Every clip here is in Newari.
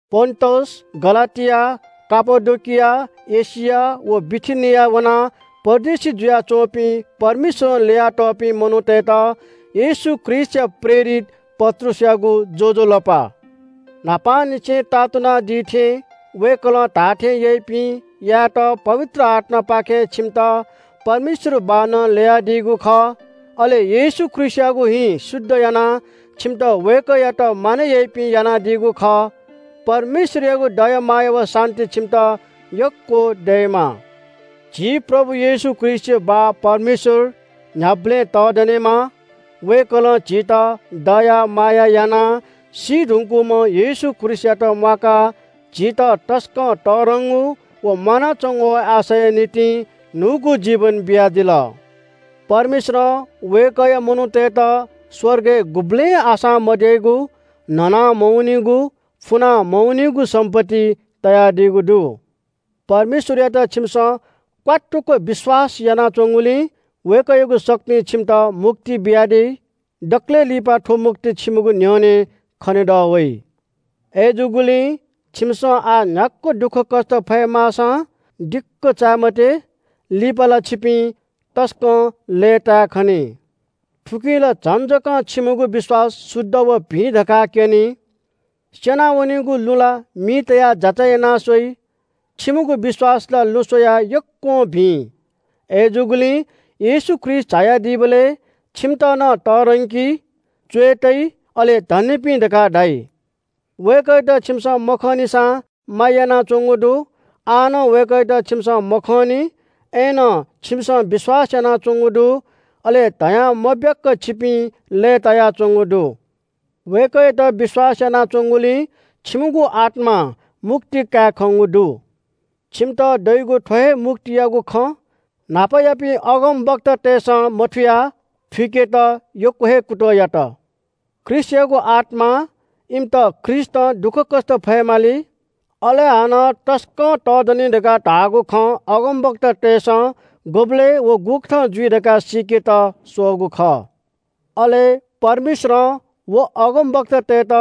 पोन्‍टस, गलातिया, कापाडोकिया, एशिया व बिथिनियाय् वनाः परदेशी जुयाच्‍वंपिं परमेश्‍वरं ल्‍ययातःपिं मनूतय्‌त येशू ख्रीष्‍टया प्रेरित पत्रुसयागु ज्‍वजलपा। न्‍हापांनिसें ताःतुनादी थें वय्‌कलं धाःथें याइपिं यायेत पवित्र आत्‍मापाखें छिमित परमेश्‍वर बाःनं ल्‍ययादीगु खः। अले येशू ख्रीष्‍टयागु हिं शुद्ध यानाः छिमित वय्‌कःयात मानय् याइपिं यानादीगु खः। परमेश्‍वरयागु दया माया व शान्‍ति छिमित यक्‍व दयेमा। झी प्रभु येशू ख्रीष्‍टया बाः परमेश्‍वर न्‍ह्याबलें तःधनेमा। वय्‌कलं झीत दया माया यानाः सी धुंकूम्‍ह येशू ख्रीष्‍टयात म्‍वाकाः झीत तसकं तःधंगु व म्‍वानाच्‍वंगु आशाया निंतिं न्‍हूगु जीवन बियादिल। परमेश्‍वरं वय्‌कःया मनूतय्‌त स्‍वर्गय् गुबलें आशां मद्याइगु, न्‍हना मवनीगु, फुना मवनीगु सम्‍पत्ति तयादीगु दु। परमेश्‍वरयात छिमिसं क्‍वात्तुक विश्‍वास यानाच्‍वंगुलिं वय्‌कःयागु शक्तिं छिमित मुक्ति बियादी। दकलय् लिपा थ्‍व मुक्ति छिमिगु न्‍ह्यःने खनेदः वइ। अय्‌जूगुलिं छिमिसं आः न्‍ह्याक्‍व दुःखकष्‍ट फयेमाःसां दिक्‍क चाये मते। लिपा ला छिपिं तसकं लय्‌ताय् खनी। थुकिं ला झन जक छिमिगु विश्‍वास शुद्ध व भिं धकाः क्‍यनी। स्‍यनावनीगु लुँ ला मिइ तयाः जाँचय् याना स्‍वइ। छिमिगु विश्‍वास ला लुँ स्‍वयाः यक्‍वं भिं। अय्‌जूगुलिं येशू ख्रीष्‍ट झायादीबलय् छिमित नं तःधंकी, च्‍वय् तइ, अले धन्‍यपिं धकाः धाइ। वय्‌कःयात छिमिसं मखंनिसां माया यानाच्‍वंगु दु। आः नं वय्‌कःयात छिमिसं मखंनि, अय्‌नं छिमिसं विश्‍वास यानाच्‍वंगु दु। अले धयां मब्‍याक छिपिं लय्‌तायाच्‍वंगु दु। वय्‌कःयात विश्‍वास यानाच्‍वंगुलिं छिमिगु आत्‍मां मुक्ति काये खंगु दु। छिमित दइगु थ्‍व हे मुक्तियागु खँ, न्‍हापायापिं अगमवक्तातय्‌सं मथुयाः थुइकेत यक्‍व हे कुतः यात। ख्रीष्‍टयागु आत्‍मां इमित ख्रीष्‍टं दुःखकष्‍ट फयेमाली, अले हानं तसकं तःधनी धकाः धाःगु खँ अगमवक्तातय्‌सं गुबलय् व गुकथं जुइ धकाः सीकेत स्‍वःगु खः। अले परमेश्‍वरं व अगमवक्तातय्‌त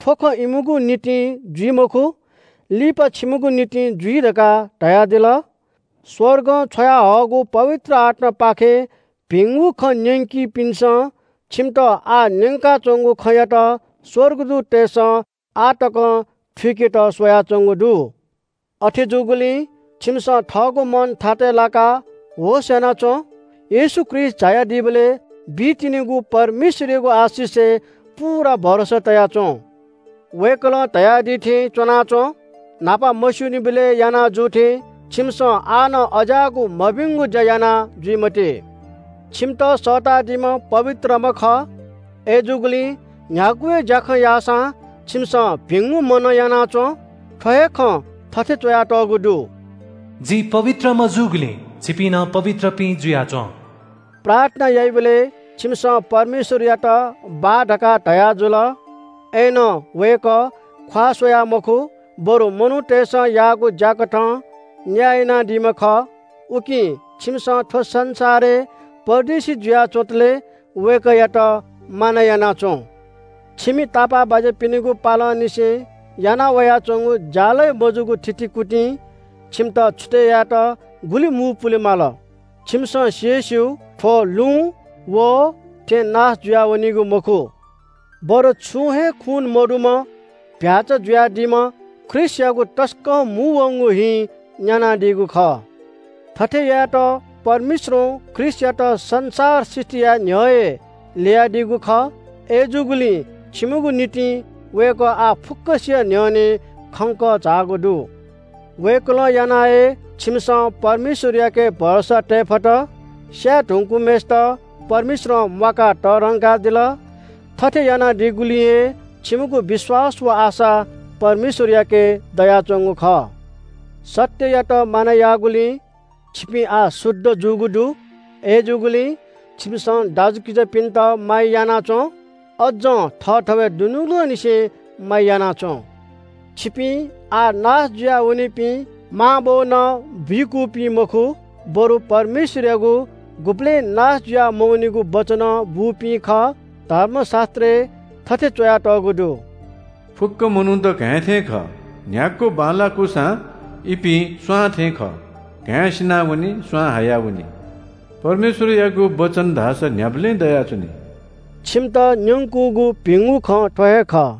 थ्‍व खँ इमिगु निंतिं जुइ मखु, लिपा छिमिगु निंतिं जुइ धकाः धयादिल। स्‍वर्गं छ्वयाहःगु पवित्र आत्‍मापाखें भिंगु खँ न्‍यंकीपिन्‍सं छिमित आः न्‍यंकाच्‍वंगु खँयात स्‍वर्गदूततय्‌सं आः तकं थुइकेत स्‍वयाच्‍वंगु दु। अथे जूगुलिं छिमिसं थःगु मन थातय् लाकाः होश‍ यानाच्‍वँ। येशू ख्रीष्‍ट झायादीबलय् बी तिनिगु परमेश्‍वरयागु आशिषय् पूरा भरोसा तया च्‍वँ। वय्‌कलं धयादी थें च्‍वनाच्‍वँ। न्‍हापा मस्‍यूनिबलय् याना जू थें छिमिसं आः नं अज्‍याःगु मभिंगु ज्‍या याना जुइ मते। छिमित सःतादीम्‍ह पवित्रम्‍ह खः। अय्‌जूगुलिं न्‍ह्यागु हे ज्‍याखँ याःसां छिमिसं भिंगु मनं याना च्‍वँ। थ्‍व हे खँ थथे च्‍वयातःगु दु – “जि पवित्रम्‍ह जूगुलिं छिपिं नं पवित्रपिं जुयाच्‍वँ।” प्रार्थना याइबलय् छिमिसं परमेश्‍वरयात बाः धकाः धयाजुल। अय्‌नं वय्‌कः ख्‍वाः स्‍वयाः मखु, बरु मनूतय्‌सं याःगु ज्‍याकथं न्‍याय यानादीम्‍ह खः। उकिं छिमिसं थ्‍व संसारय् परदेशी जुया च्‍वंतले वय्‌कःयात मानय् याना च्‍वँ। छिमि तापाःबाज्‍यापिनिगु पालंनिसें याना वयाच्‍वंगु ज्‍यालगय् मजूगु थितिकुतिं छिमित छुतय् यायेत गुलि मू पुलेमाल, छिमिसं सि हे स्‍यू। थ्‍व लुँ वहः थें नाश जुया वनीगु मखु, बरु छुं हे खू मदुम्‍ह चीधिकःम्‍ह भ्‍याःचा जुयादीम्‍ह ख्रीष्‍टयागु तसकं मू वंगु हिं न्‍यानादीगु खः। थथे यायेत परमेश्‍वरं ख्रीष्‍टयात संसार सृष्‍टि याये न्‍ह्यः हे ल्‍ययादीगु खः। अय्‌जूगुलिं छिमिगु निंतिं वय्‌कः आः फुक्‍कसिया न्‍ह्यःने खंक झाःगु दु। वय्‌कलं यानाः हे छिमिसं परमेश्‍वरयाके भरोसा तये फत। स्‍याये धुंकूम्‍हय्‌सित परमेश्‍वरं म्‍वाकाः तःधंकादिल। थथे यानादीगुलिं हे छिमिगु विश्‍वास व आशा परमेश्‍वरयाके दयाच्‍वंगु खः। सत्‍ययात मानय् याःगुलिं छिपिं आः शुद्ध जूगु दु। अय्‌जूगुलिं छिमिसं दाजुकिजापिन्‍त माया याना च्‍वँ। अज्‍जं थःथवय् दुनुगलंनिसें माया याना च्‍वँ। छिपिं आः नाश जुयावनीपिं मांबौनं बुइकूपिं मखु, बरु परमेश्‍वरयागु गुबलें नाश जुया मवनीगु वचनं बूपिं खः। धर्मशास्‍त्रय् थथे च्‍वयातःगु दु – “फुक्‍क मनूत घाँय् थें खः। न्‍ह्याक्‍व बांलाकूसां इपिं स्‍वां थें खः। घाँय् सिनावनी, स्‍वां हायावनी। परमेश्‍वरयागु वचन धाःसा न्‍ह्याबलें दयाच्‍वनी।” छिमित न्‍यंकूगु भिंगु खँ थ्‍व हे खः।